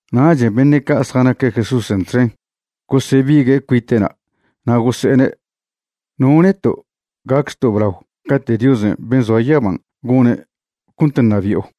Nachen' beṉe' ca' zjanaque' Jesúsen' txen gosebigue' cuite'na', na' gose'ene': ―¿No neto' gacchto' blao cate' Diosen' ben' zoa yaban' gone' cont ṉabi'o?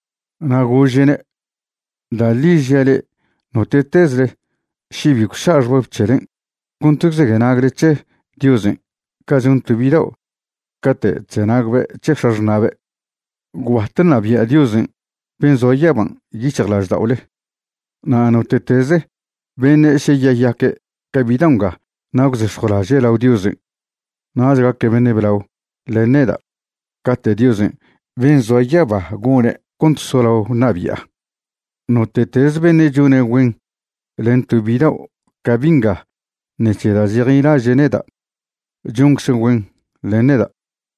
Na' gože'ne': ―Da' ḻi žia' le'e, note'tezle še bi gwša' xbab c̱helen' cont gwzenagle c̱he Diosen' ca chon to bidao' cate' chzenagbe' c̱he x̱axṉa'be', gwbat ṉabia' Diosen' ben' zoa yaban' yic̱hjlažda'ole. Na' note'teze beṉe' še yeyaque' ca bidao' nga na' gwzex̱jwlaže' lao Diosen', nach gaque' beṉe' blao len neda' cate' Diosen' ben' zoa yaba gone' cont solao ṉabi'a. Note'teze beṉe' chone' güen len to bidao' ca bi' nga ṉec̱he da' chejnilaže' neda', choncze' güen len neda'.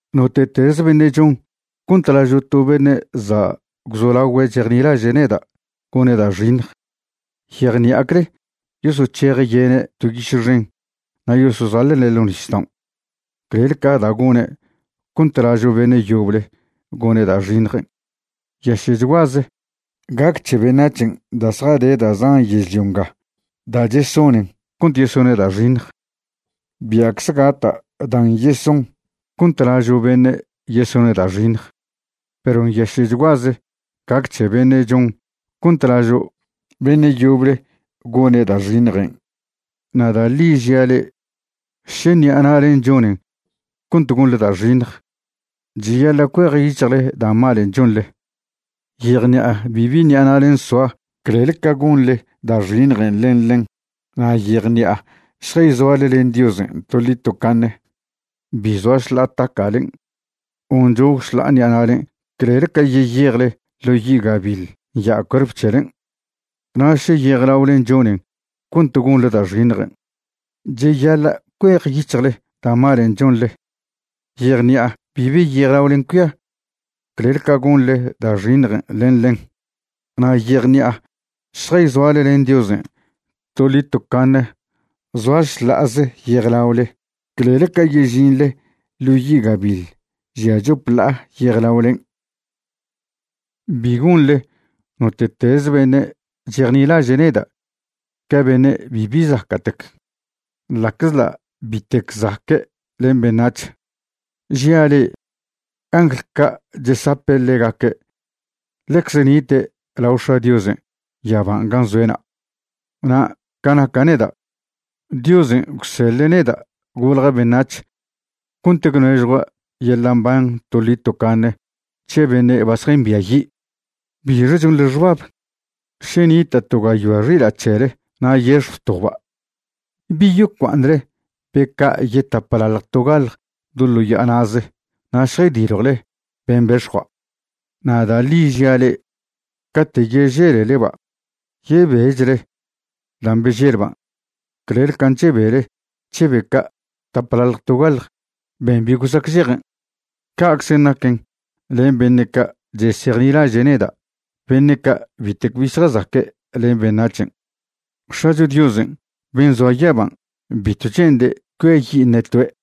’Note'teze beṉe' chon cont lažo' to beṉe' za' gwzolagüe' chejnilaže' neda' gone' da' xiṉj, yejṉi'acle yosoc̱heje' yene' to yiše xen na' yosozaḻe'ne' ḻo' nisdaon' clel ca da' gone' cont lažo' beṉe' yoble gone' da' xiṉjen'. Nyaše'chguaze gac c̱he beṉac̱hen' da' zjade da' zan yežlio nga da' chesonen cont yesone' da' xiṉj. Bia'cze gata' dan' yeson cont lažo' beṉe' yesone' da' xiṉj, perw nyaše'chguaze gac c̱he beṉe' chon cont lažo' beṉe' yoble gone' da' xiṉjen'. ’Na' da' ḻi žia' le'e, še ṉi'a na'len' chonen cont gonḻe da' xiṉj, cheyaḻa' cuejyic̱hjle da' malen' chonḻe. Yejṉi'a bibi ṉi'a na'len' soa clel ca gonḻe da' xiṉjen' len ḻen. Na' yejṉi'a šjayzoale len Diosen' toḻi tocaṉe bi zoa šḻa'a taca'len' o nchog šḻa'a ṉi'alen' clel ca yeyejle ḻo yi' gabiḻ nya' cuerp c̱helen'. Na' še yejlaolen' chonen cont gonḻe da' xiṉjen', cheyaḻa' cuejyic̱hjle da' malen' chonḻe. Yejṉi'a bibi yejlaolen' cuia clel ca gonḻe da' xiṉjen' len ḻen. Na' yejṉi'a šjayzoale len Diosen' toḻi tocaṉe zoa šḻa'aze yejlaole clel ca yežinḻe ḻo yi' gabiḻ žia chop ḻa'a yejlaolen'. ’Bi gonḻe note'teze beṉe' chejnilaže' neda' ca beṉe' bibi zaca'tec, ḻa'czḻa' bitec zaque' len beṉac̱h. Žia' le'e, angl ca' chesape' ḻegaque' ḻecze nite' lao X̱a' Diosen' yaban' gan' zoe'na'. Na' ca naca' neda', Diosen' gwseḻe' neda' golja' beṉac̱h cont gwnežjua' yeḻa' mban toḻi tocaṉe c̱he beṉe' ba zjambiayi'. ’¿Bixe chonḻe xbab? Še nita' to gayoa xila' c̱hele na' yex̱jw toba' ¿bi yocua'aṉle be ca' yetaplalj togaḻj do ḻo ya'a na'ze na' šjaydiljwle ben' bex̱jua'? Na' da' ḻi žia' le'e, cate' yeželeleba' yebechle dan' beželban' clel ca can' chebele c̱he be ca' taplalj togaḻj ben' bi gosacžeje. Ca'czen' naquen len beṉe' ca' chesejnilaže' neda' beṉe' ca' bitec bi zjazaque' len beṉac̱hen'. X̱acho Diosen' ben' zoa yaban' bitw che'nde' cuiayi' ṉe toe'.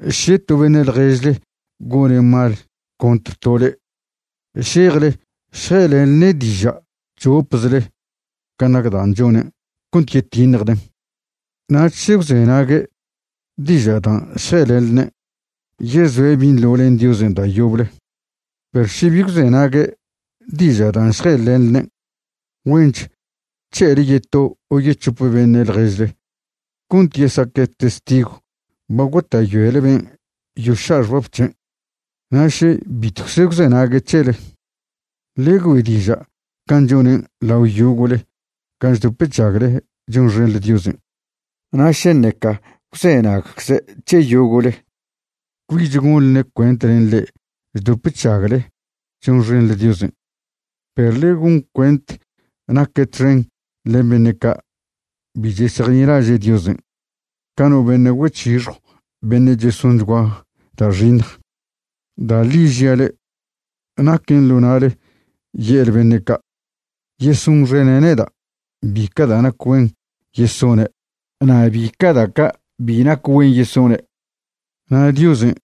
’Še to beṉe' ḻježle gone' mal contr to le'e, šejle šje'elenḻene' diža' chopzle can' nac dan' chonen' cont yetiṉjden'. Na' še gwzenague' diža' dan' šje'elenḻenen', yezoe' binḻo len Diosen' da' yoble. Perw še bi gwzenague' diža' dan' šje'elenḻenen', güench c̱he'ele yeto o yec̱hope beṉe' ḻježle cont yesaque' testigw ba gota'yoele ben' yoša' xbab c̱hen'. Na' še bitwcze gwzenague' c̱hele, ḻe güe' diža' can' chonen' lao yogo'le gan' chdop chžagle chonxenḻe Diosen'. Na' še ṉeca gwzenagcze' c̱he yogo'le, cbich gonḻne' cuent len le'e chdop chžagle chonxenḻe Diosen'. Perw ḻe gon cuent naque' txen len beṉe' ca' bi chesejnilaže' Diosen', ca no beṉe' güec̱hixjw beṉe' chesonchgüa da' xiṉj. ’Da' ḻi žia' le'e, naquen ḻo na'le ye'le beṉe' ca' yesonxene' neda' bica' da' nac güen yesone' na' bica' da' ca' bi nac güen yesone'. Na' Diosen'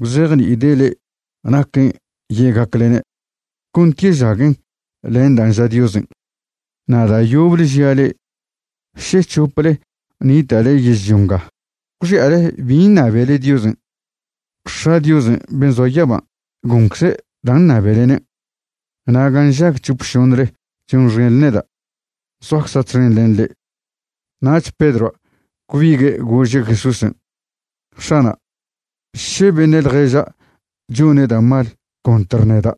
gwzejni'ide' le'e naquen' ye'gaclene' cont yežaguen len dan' ža Diosen'. ’Na' da' yoble žia' le'e, še c̱hople nita'le yežlio nga gwxi'ale bin' ṉabele Diosen', X̱a' Diosen' ben' zoa yaban' goncze' dan' ṉabelenen'. Na' gan' nžag c̱hope šoṉle chonxenḻe neda', zoacza' txen len le'e. Nach Pedroa' gwbigue' gože' Jesúsen': ―X̱ana', še beṉe' ḻježa' chone' da' mal contr neda',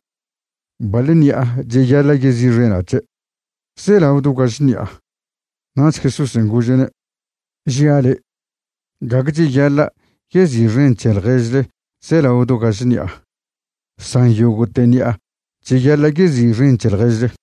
¿baḻ ṉi'a cheyaḻa' yezi'xena' c̱he'? ¿zelao do gaž ṉi'a? Nach Jesúsen' gože'ne': ―Žia' le', gague cheyaḻa' yezi'xen c̱he ḻježle zelao do gaž ṉi'a, san yogo'te ṉi'a cheyaḻa' yezi'xen c̱he ḻježle.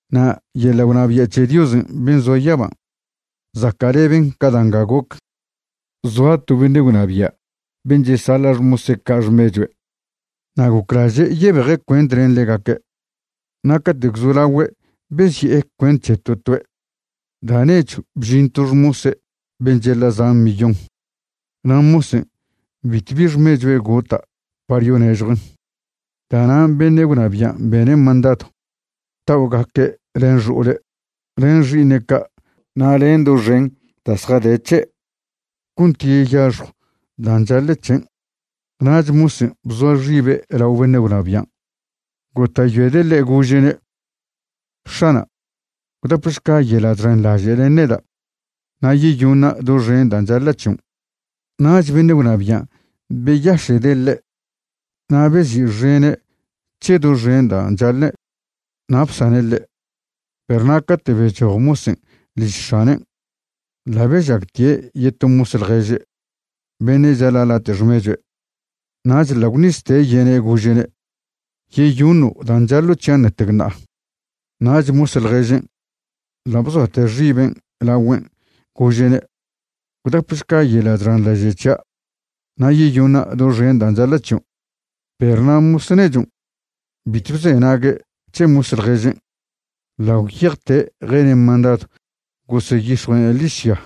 ’Na' yeḻa' gwnabia' c̱he Diosen' ben' zoa yaban' zaca'leben ca da' nga goc. Zoa to beṉe' gwnabia' ben' chesaḻa' xmose' ca' xmechue'. Na' goclaže' yebeje' cuent len ḻegaque'. Na' cate' gwzolagüe' bezi'e cuent c̱he to toe', da' nechw bžin to xmose' ben' chaḻa' zan millón. Na' mosen' bitwbi xmechue' gota' par yonežjuen'. Da'nan' beṉe' gwnabian' bene' mandadw ta'ogaque' len xo'ole', len xi'iṉe' ca' na' len doxen da' zjade c̱he' cont yeyaxjw dan' chaḻe' c̱hen'. Nach mosen' bzoa xibe' lao beṉe' gwnabian' gota'yoede' ḻe' gože'ne': “X̱ana', gwdapešca yeḻa' chxenḻaže' len neda', na' yeyoṉa' doxen dan' chaḻa' c̱hion'.” Nach beṉe' gwnabian' beyaše'de' ḻe' na' bezi'xene' c̱he doxen dan' chaḻe' na' bsane' ḻe'. Perw na' cate' bechoj mosen' liž x̱anen', ḻa' bežagtie' yeto mos ḻježe' beṉe' chaḻa' late' xmechue'. Nach ḻa' gwṉizte' yene' gože'ne': “Yeyoṉo' dan' chaḻo' c̱hian' ṉetec ṉa'a.” Nach mos ḻježen' ḻa' bzoate' xibe' lagüen', gože'ne': “Gwdapešca yeḻa' chxenḻaže' c̱hia' na' yeyoṉa' doxen dan' chaḻa' c̱hion'.” Perw na' mos nechon' bitw bzenague' c̱he mos ḻježen'. Ḻa' gwyejte' jene' mandadw goseyix̱jue'ne' ḻižya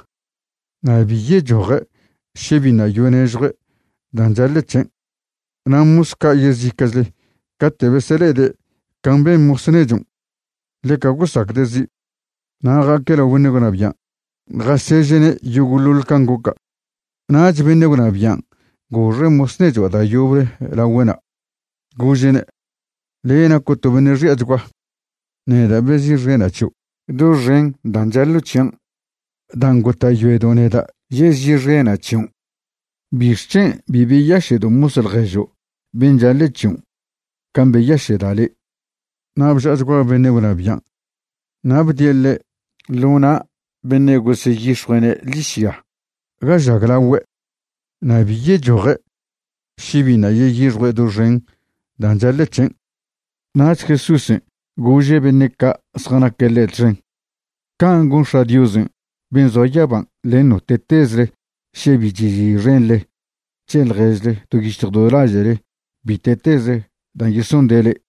na' bi yechoje' še biṉa' yonežjue' dan' chaḻe' c̱hen'. Na' mos ca' yezica'chle cate' besele'ede' can' ben' mos nechon', ḻeca gosacde' zi'. Na' ja'aque' lao beṉe' gwnabian' jaseže'ne' yogo'ḻoḻ can' goca'. Nach beṉe' gwnabian' goxe' mos nechua' da' yoble lagüe'na', gože'ne': “Le' naco' to beṉe' xi'achgua. Neda' bezi'xena' c̱hio' doxen dan' chaḻo' c̱hian' dan' gota'yoedo' neda' yezi'xena' c̱hion'. ¿Bixc̱hen' bi beyaše'do' mos ḻježo' ben' chaḻe' c̱hion' can' beyaše'da' le'?” Na' bža'achgua beṉe' gwnabian' na' bdie' ḻe' ḻo na' beṉe' goseyix̱jue'ne' ḻižya ga žaglaogüe', na' bi yechoje' še biṉa' yeyixjue' doxen dan' chaḻe' c̱hen'. Nach Jesúsen' gože' beṉe' ca' zjanaque' ḻe' txen: ―Can' gon X̱a' Diosen' ben' zoa yaban' len note'tezle še bi chezi'xenḻe c̱he ḻježle do yic̱hj do laže'le bite'teze dan' chesonde' le'e.